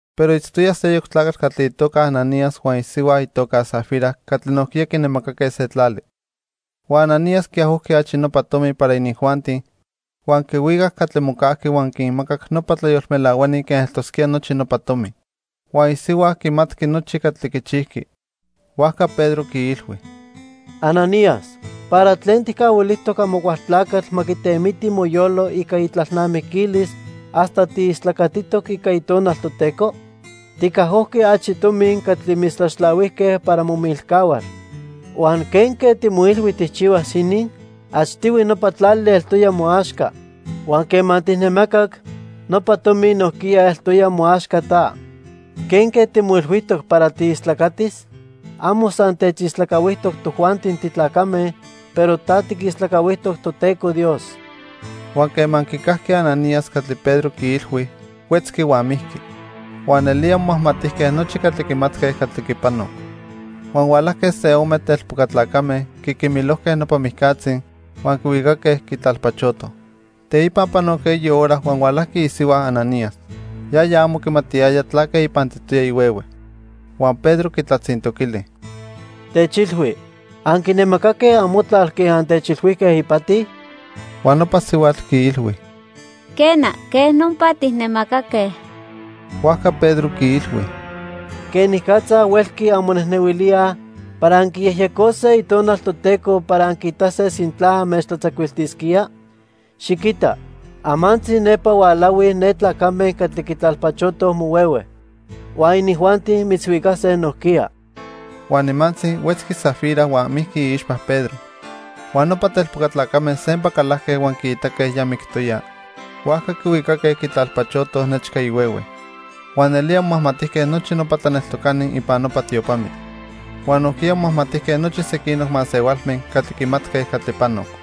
Pero itztoya seyoc tlacatl catli itoca Ananías huan isihua itoca Safira catli nojquiya quinemacaque se tlali. Huan Ananías quiajojqui achi nopa tomi para inijuanti, huan quihuicac catli mocajqui huan quinmacac nopa tlayolmelahuani quen eltosquía nochi nopa tomi. Huan isihua quimatqui nochi catli quichijqui. Huajca Pedro quiilhui: —Ananías, ¿para tlen tijcahuilijtoc Amocualtlacatl ma quitemiti moyolo ica itlalnamiquilis hasta tiistlacatitoc ica Itonal Toteco? Ticajojqui achi tomi catli mitztlaxtlahuijque para momilcahual. Huan ¿quenque timoilhui tijchihuas inin? Achtihui nopa tlali eltoya moaxca. Huan quema tijnemacac, nopa tomi nojquiya eltoya moaxca ta. ¿Quenque timoilhuijtoc para tiistlacatis? Amo san techistlacahuijtoc tojuanti titlacame, pero ta tiquistlacahuijtoc Toteco Dios. Huan quema quicajqui Ananías catli Pedro quiilhui, huetzqui huan mijqui. Huan nelía momajmatijque nochi catli quimatque catli quipanoc. Huan hualajque se ome telpoca tlacame, quiquimilojque nopa mijcatzi, huan quihuicaque, quitlalpachotoj. Teipa panoc eyi hora huan hualajqui isihua Ananías. Yaya amo quimatiyaya tlaque ipantitoya ihuehue. Huan Pedro quitlatzintoquili: —Techilhui, ¿anquinemacaque amotlal quen antechilhuijque ipati? Huan nopa sihuatl quiilhui: —Quena, quej nopa tijnemacaque. Huajca Pedro quiilhui: —¿Quenicatza huelqui anmonejnehuilíaj para anquiyejyecose Itonal Toteco para anquiitase sintla anmechtlatzacuiltisquía? Xiquita, amantzi nepa hualahuij ne tlacame catli quitlalpachotoj mohuehue. Huan inijuanti mitzhuicase nojquiya. Huan nimantzi, huetzqui Safira huan mijqui iixpa Pedro. Huan nopa telpoca tlacame sempa calajque huan quiitaque ya mictoya, huajca quihuicaque quitlalpachotoj nechca ihuehue. Huan nelía momajmatijque nochi nopa tlaneltocani ipan nopa tiopamitl. Huan nojquiya momajmatijque nochi sequinoc masehualme catli quimatque catli panoc.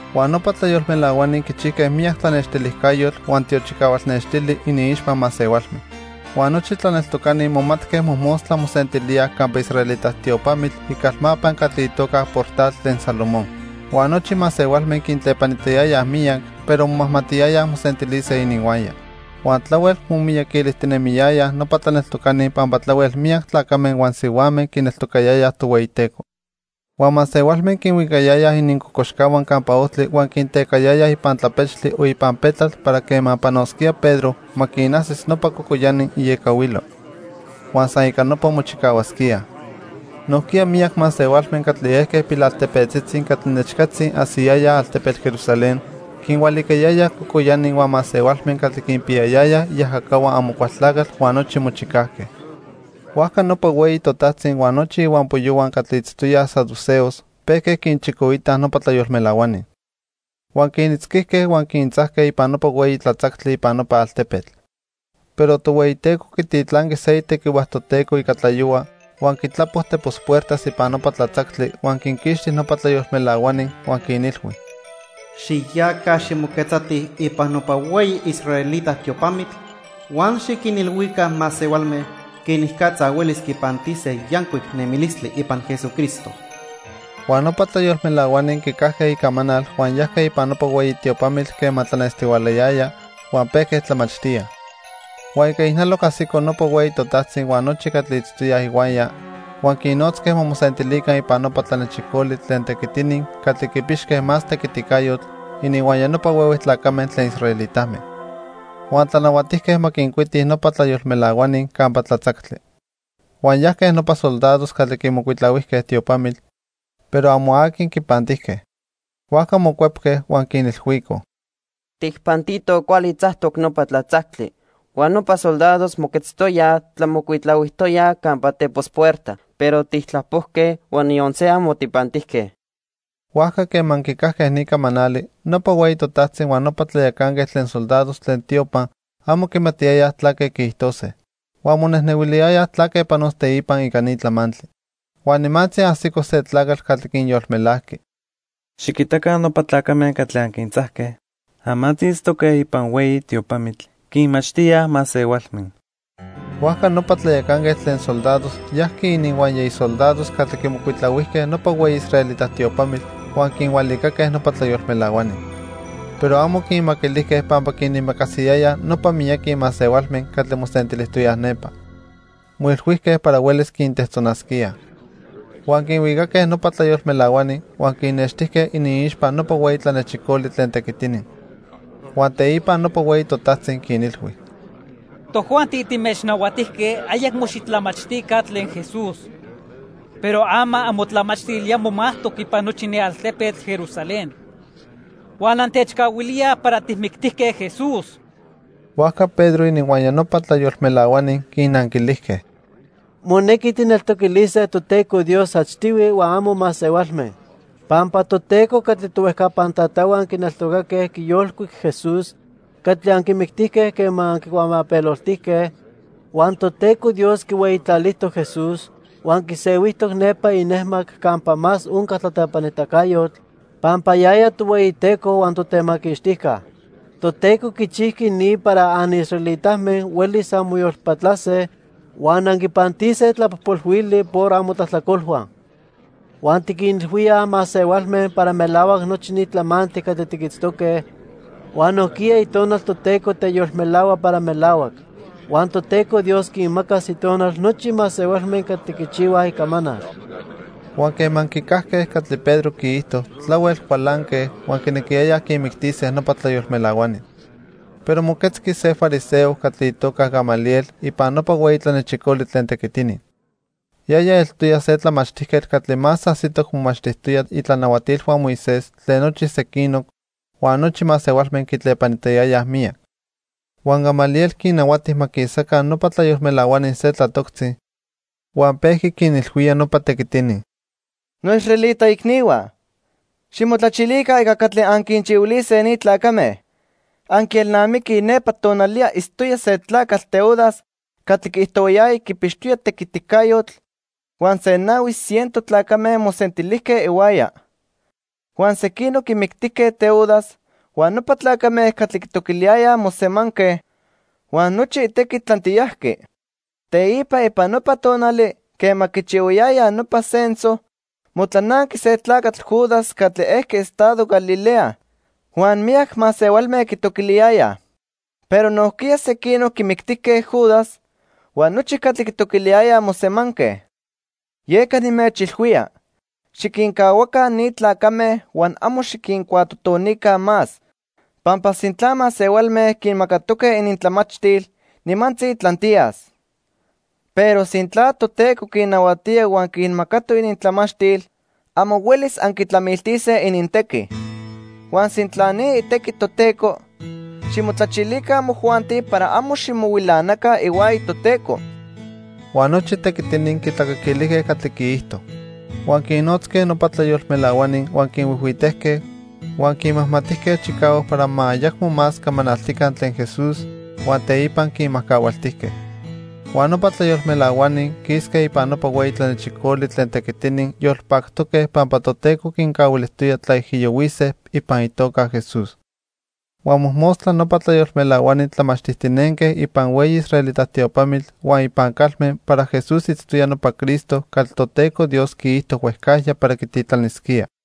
Huan nopa tlayolmelahuani quichijque miyac tlanextilijcayotl huan tiochicahual nextili iniixpa masehualme. Huan nochi tlaneltocani momatque mojmostla mosentilíaj campa israelita tiopamitl icalmapa catli itoca Portal tlen Salomón. Huan nochi masehualme quintlepanitayayaj miyac, pero momajmatiyayaj mosentilise ininhuaya. Huan tlahuel momiyaquilijtinemiyayaj nopa tlaneltocani pampa tlahuel miyac tlacame huan sihuame quineltocayayaj Tohueyiteco. Huan masehualme quinhuicayayaj inincocoxcahua campa ojtli huan quintecayayaj ipan tlapechtli o ipan petlatl para quema panosquía Pedro, ma quinajsis nopa cocoyani iecahuilo. Huan san ica nopa mochicahuasquíaj. Nojquiya miyac masehualme catli ejque pilaltepetzitzi catli nechcatzi ajsiyayaj altepetl Jerusalén, quinhualicayayaj cocoyani huan masehualme catli quinpiyayayaj iajacahua Amocualtlacatl huan nochi mochicajque. Huajca nopa hueyi totajtzi huan nochi ihuampoyohua catli itztoyaj saduceos pejque quinchicoitaj nopa tlayolmelahuani. Huan quinitzquijque huan quintzajque ipan nopa hueyi tlatzactli ipan nopa altepetl. Pero Tohueyiteco quititlanqui se itequihua Toteco ica tlayohua huan quitlapo tepos puertas ipan nopa tlatzactli huan quinquixti nopa tlayolmelahuani huan quinilhui: "Xiyaca ximoquetzatij ipan nopa hueyi israelita tiopamitl huan xiquinilhuica masehualme quenicatza huelis quipantise yancuic nemilistli ipan Jesucristo." Huan nopa tlayolmelahuani quicajque icamanal huan yajque ipan nopa hueyi tiopamitl quema tlanestihualayaya, huan pejque tlamachtíaj. Huan ica ijnaloc ajsico nopa hueyi totajtzi huan nochi catli itztoyaj ihuaya, huan quinnotzque ma mosentilica ipan nopa tlanechicoli tlen tequitini catli quipixque más tequiticayotl ininhuaya nopa huehue tlacame tlen israelitame. Huan tlanahuatijque ma quincuitij nopa tlayolmelahuani campa tlatzactli. Huan yajque nopa soldados catli quimocuitlahuijque tiopamitl, pero amo aqui quipantijque. Huajca mocuepque, huan quinilhuicoj: —Tijpantitoj cuali tzactoc nopa tlatzactli, huan nopa soldados moquetztoyaj tlamocuitlahuijtoyaj campa tepos puerta, pero tijtlapojque huan niyon se amo tijpantijque. Huajca quema quicajque ni camanali, nopa hueyi totajtzi huan nopa tlayacanquetl tlen soldados tlen tiopa amo quimatiyayaj tlaque quiijtose. Huan monejnehuiliyayaj tlaque panos teipa ica ni tlamantli. Huan nimantzi ajsico se tlacatl catli quinyolmelajqui: —Xiquitaca nopa tlacame catli anquintzajque, amantzi itztoque ipan hueyi tiopamitl, quinmachtíaj masehualme. Huajca nopa tlayacanquetl tlen soldados yajqui ininhuaya isoldados catli quimocuitlahuijque nopa hueyi israelita tiopamitl huan quinhualicaque nopa tlayolmelahuani. Pero amo quinmaquilijque pampa quinimacasiyayaj nopa miyaqui masehualme catli mosentilijtoyaj nepa. Moilhuijque para huelis quintejtzonasquíaj. Huan quinhuicaque nopa tlayolmelahuani huan quinnextijque iniixpa nopa hueyi tlanechicoli tlen tequitini. Huan teipa nopa hueyi totajtzi quinilhui: —Tojuanti timechnahuatijque ayacmo xitlamachtica tlen Jesús. Pero ama amotlamachtil ya momajtoc ipan nochi ni altepetl Jerusalén. Huan antechcahuilíaj para tijmictijque Jesús. Huajca Pedro ininhuaya nopa tlayolmelahuani quinnanquilijque: —Monequi tijneltoquilise Toteco Dios achtihui huan amo masehualme. Pampa Toteco catli tohuejcapan tatahua quineltocaque quiyolcuic Jesús catli anquimictijque quema anquicuamapeloltijque, Huan Toteco Dios quihueyitlalijtoc Jesús huan quisehuijtoc nepa inejmac campa más onca tlatlepanitacayotl pampa yaya Tohueyiteco huan Totemaquixtijca. Toteco quichijqui ni para anisraelitame huelis anmoyolpatlase huan anquipantise tlapojpolhuili por amotlajtlacolhua. Huan tiquinilhuíaj masehualme para melahuac nochi ni tlamantli catli tiquitztoque huan nojquiya Itonal Toteco teyolmelahua para melahuac. Huan Toteco Dios quinmacas Itonal nochi masehualme catli quichihuaj icamanal. Huan quema quicajque catli Pedro quiijto, tlahuel cualanque, huan quinequiyayaj quinmictise nopa tlayolmelahuani. Pero moquetzqui se fariseo catli itoca Gamaliel ipan nopa hueyi tlanechicoli tlen tequitini. Yaya eltoya se tlamachtijquetl catli más ajsitoc momachtijtoya itlanahuatilhua Moisés tlen nochi sequinoc huan nochi masehualme quitlepanitayayaj miyac. Huan Gamaliel quinnahuati ma quisaca nopa tlayolmelahuani se tlatoctzi, huan pejqui quinilhuía nopa tequitini: —Noisraelita icnihua, ximotlachilica ica catli anquinchihuilise ni tlacame. Anquielnamiquij nepa tonaliya itztoya se tlacatl Teudas catli quiijtohuayaya quipixtoya tequiticayotl, huan se nahui ciento tlacame mosentilijque ihuaya. Huan sequinoc quimictijque Teudas, huan nopa tlacame catli quitoquiliyayaj mosemanque, huan nochi itequi tlantiyajqui. Teipa ipan nopa tonali quema quichihuayayaj nopa censo, motlananqui se tlacatl Judas catli ejqui estado Galilea, huan miyac masehualme quitoquiliyayaj. Pero nojquiya sequinoc quimictijque Judas, huan nochi catli quitoquiliyayaj mosemanque. Yeca nimechilhuía, xiquincahuaca ni tlacame huan amo xiquincuatotonica más, pampa sintla masehualme quinmacatoque inintlamachtil, nimantzi tlantiyas. Pero sintla Toteco quinnahuatía huan quinmacatoc inintlamachtil, amo huelis anquitlamiltise inintequi. Huan sintla ni itequi Toteco, ximotlachilica amojuanti para amo ximohuilanaca ihuaya Toteco. Huan nochi tequitini quitlacaquilijque catli quiijto. Huan quinnotzque nopa tlayolmelahuani huan quinhuijhuitejque, huan quinmajmatijque chicahuac para ma ayacmo más camanaltica tlen Jesús, huan teipa quinmajcahualtijque. Huan nopa tlayolmelahuani quisque ipan nopa hueyi tlanechicoli tlen tequitini yolpactoque pampa Toteco quincahuilijtoya tlaijiyohuise ipan itoca Jesús. Huan mojmostla nopa tlayolmelahuani tlamachtijtinenque ipan hueyi israelita tiopamitl huan ipan calme para Jesús itztoya nopa Cristo catli Toteco Dios quiijto huejcajya para quititlanisquía.